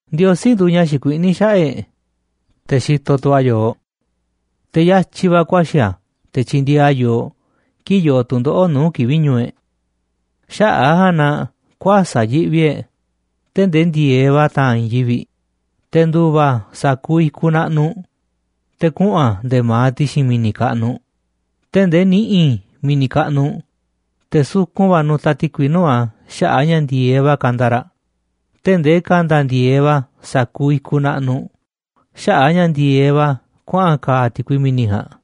Ndiosí nduuꞌ ña̱ xikuiꞌní xaꞌa̱ꞌ e̱ꞌ, te̱ xitoꞌ tu̱ a̱ yooꞌ, te̱ yatyi̱ va̱ ku̱a̱xi̱ a̱ te̱ tyindieeꞌ a̱ yooꞌ kii̱ꞌ yoo tu̱ndoꞌo̱ꞌ nuu̱ꞌ kivi̱ꞌ ñu̱u̱ e̱ꞌ. Xaꞌa̱ꞌ a̱ ja̱a̱nꞌ na kuäsa̱ꞌ yiꞌvi e̱ꞌ tee̱ꞌ ndee ndi̱e̱eꞌ va̱ ta̱a̱n i̱i̱n yivi̱ꞌ, te̱ ndu̱va̱ sa̱kuuꞌ i̱kuꞌ naꞌnuꞌ te̱ kuꞌu̱n a̱ nde̱e̱ ma̱aꞌ ti̱xi̱n mi̱ni̱ kaꞌnuꞌ, tee̱ꞌ ndee ni̱ꞌi̱ mi̱ni̱ kaꞌnuꞌ, te̱ sukun va̱ nu̱ta̱ ti̱kui nuu̱ꞌ a̱ xaꞌa̱ꞌ a̱ ña̱ ndi̱e̱eꞌ va̱ kanda raꞌ, tee̱ꞌ ndee ka̱nda̱ ndi̱e̱eꞌ va̱ sa̱kuuꞌ i̱kuꞌ naꞌnuꞌ xaꞌa̱ꞌ a̱ ña̱ ndi̱e̱eꞌ va̱ kuaꞌa̱n ka̱a̱ ti̱kui mi̱ni̱ ja̱a̱nꞌ.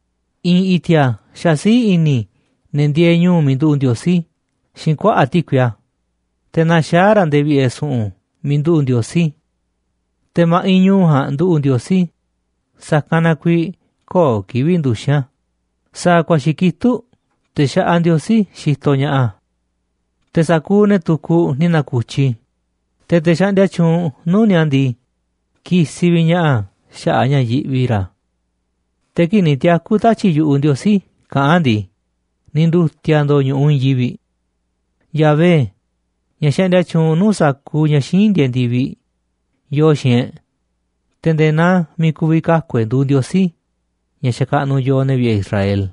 I̱i̱n i̱ti̱a̱ xasiíꞌ i̱ni̱ ne̱ ndieeꞌ ñu̱u̱ miiꞌ nduꞌu̱ꞌ Ndiosí xiinꞌ kuaꞌa̱ꞌ ti̱kui a̱, te̱ naxaá raꞌ nde̱e̱ vi̱ꞌe̱ su̱ꞌu̱n miiꞌ nduꞌu̱ꞌ Ndiosí. Te̱ ma̱ꞌiꞌ ñu̱u̱ ja̱a̱nꞌ nduꞌu̱ꞌ Ndiosí, sa̱kanꞌ na kuiiꞌ köo̱ꞌ kivi̱ꞌ nduxi̱n a̱, sa̱a̱ ku̱a̱xi̱ kitúꞌ te̱ xaꞌaꞌ Ndiosí xitoꞌ ña̱ꞌaꞌ a̱. Te̱ sa̱kuuꞌ ne̱ tukuꞌ ni̱ na̱ku̱tyi, te̱ te̱ xaꞌndia tyuunꞌ nuu̱ꞌ ni̱a̱ ndii, kisiꞌ vi̱ꞌ ña̱ꞌaꞌ a̱ xaꞌa̱ꞌ a̱ ña̱ yiꞌvi ra̱. Te̱ kii̱ꞌ ni̱ tiaku̱ tatyi̱ꞌ yu̱ꞌuꞌ Ndiosí kaꞌán a̱ ndii, ni̱ ndu̱ti̱a̱ ndo̱o̱ ñu̱ꞌuꞌ i̱i̱n yivi̱ꞌ. Yahvé, ña̱ xaꞌndia tyuunꞌ nuu̱ꞌ sa̱kuuꞌ ña̱ xíinꞌ ndieeꞌ ndi̱viꞌ, yoo xiinꞌ e̱ꞌ, te̱ nde̱e̱ naa miiꞌ ku̱vi̱ kaku̱ e̱ꞌ nduuꞌ Ndiosí ña̱ xakaꞌnuꞌ yooꞌ, ne̱ vi̱ꞌe̱ Israel.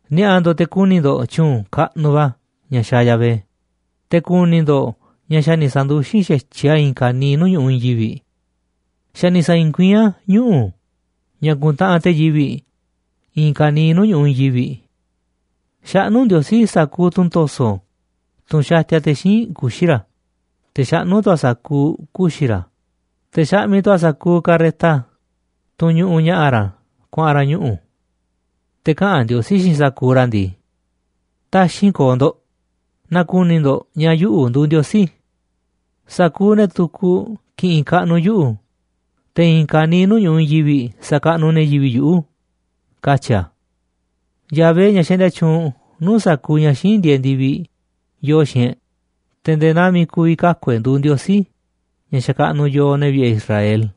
Ni̱a̱ꞌa̱ ndo̱ꞌ te̱ ku̱ni̱ ndo̱ꞌ tyu̱u̱n kaꞌnuꞌ va̱ ña̱ xaaꞌ Yahvé, te̱ ku̱ni̱ ndo̱ꞌ ña̱ xa̱ ni̱ sa̱ndu̱xin xa̱tyiꞌ a̱ i̱i̱n ka̱niiꞌ nuu̱ꞌ ñu̱ꞌuꞌ i̱i̱n yivi̱ꞌ. Xa̱ ni̱ sa̱i̱i̱n kuiín a̱ ñuꞌu̱ ña̱ kuntaꞌanꞌ te̱ yivi̱ꞌ i̱i̱n ka̱niiꞌ nuu̱ꞌ ñu̱ꞌuꞌ i̱i̱n yivi̱ꞌ. Xaꞌnú Ndiosí sa̱kuuꞌ tunꞌ to̱so̱, tunꞌ xatia te̱ xíinꞌ kuxi̱ ra̱, te̱ xaꞌnú tu̱ a̱ sa̱kuuꞌ kuxi̱ ra̱, te̱ xaꞌmiꞌ tu̱ a̱ sa̱kuuꞌ carreta, tunꞌ ñuꞌuꞌ ña̱ꞌa̱ ra̱ kuaꞌa̱n ra̱ ñuꞌu̱. Te̱ kaꞌa̱n Ndiosí xiinꞌ sa̱kuuꞌ ra̱ ndii: “Taxi̱nꞌ ko̱o̱ ndo̱ꞌ, na̱ku̱ni̱ ndo̱ꞌ ña̱ yuꞌu̱ nduuꞌ Ndiosí. Sa̱kuuꞌ ne̱ tukuꞌ ki̱ꞌi̱n kaꞌnuꞌ yuꞌu̱, te̱ i̱i̱n ka̱niiꞌ nuu̱ꞌ ñu̱ꞌuꞌ i̱i̱n yivi̱ꞌ sa̱kaꞌnuꞌ ne̱ yivi̱ꞌ yuꞌu̱”, katyi̱ a̱. Yahvé, ña̱ xaꞌndia tyuunꞌ nuu̱ꞌ sa̱kuuꞌ ña̱ xíinꞌ ndieeꞌ ndi̱viꞌ, yoo xiinꞌ e̱ꞌ, te̱ nde̱e̱ naa miiꞌ ku̱vi̱ kaku̱ e̱ꞌ nduuꞌ Ndiosí ña̱ xakaꞌnuꞌ yooꞌ, ne̱ vi̱ꞌe̱ Israel.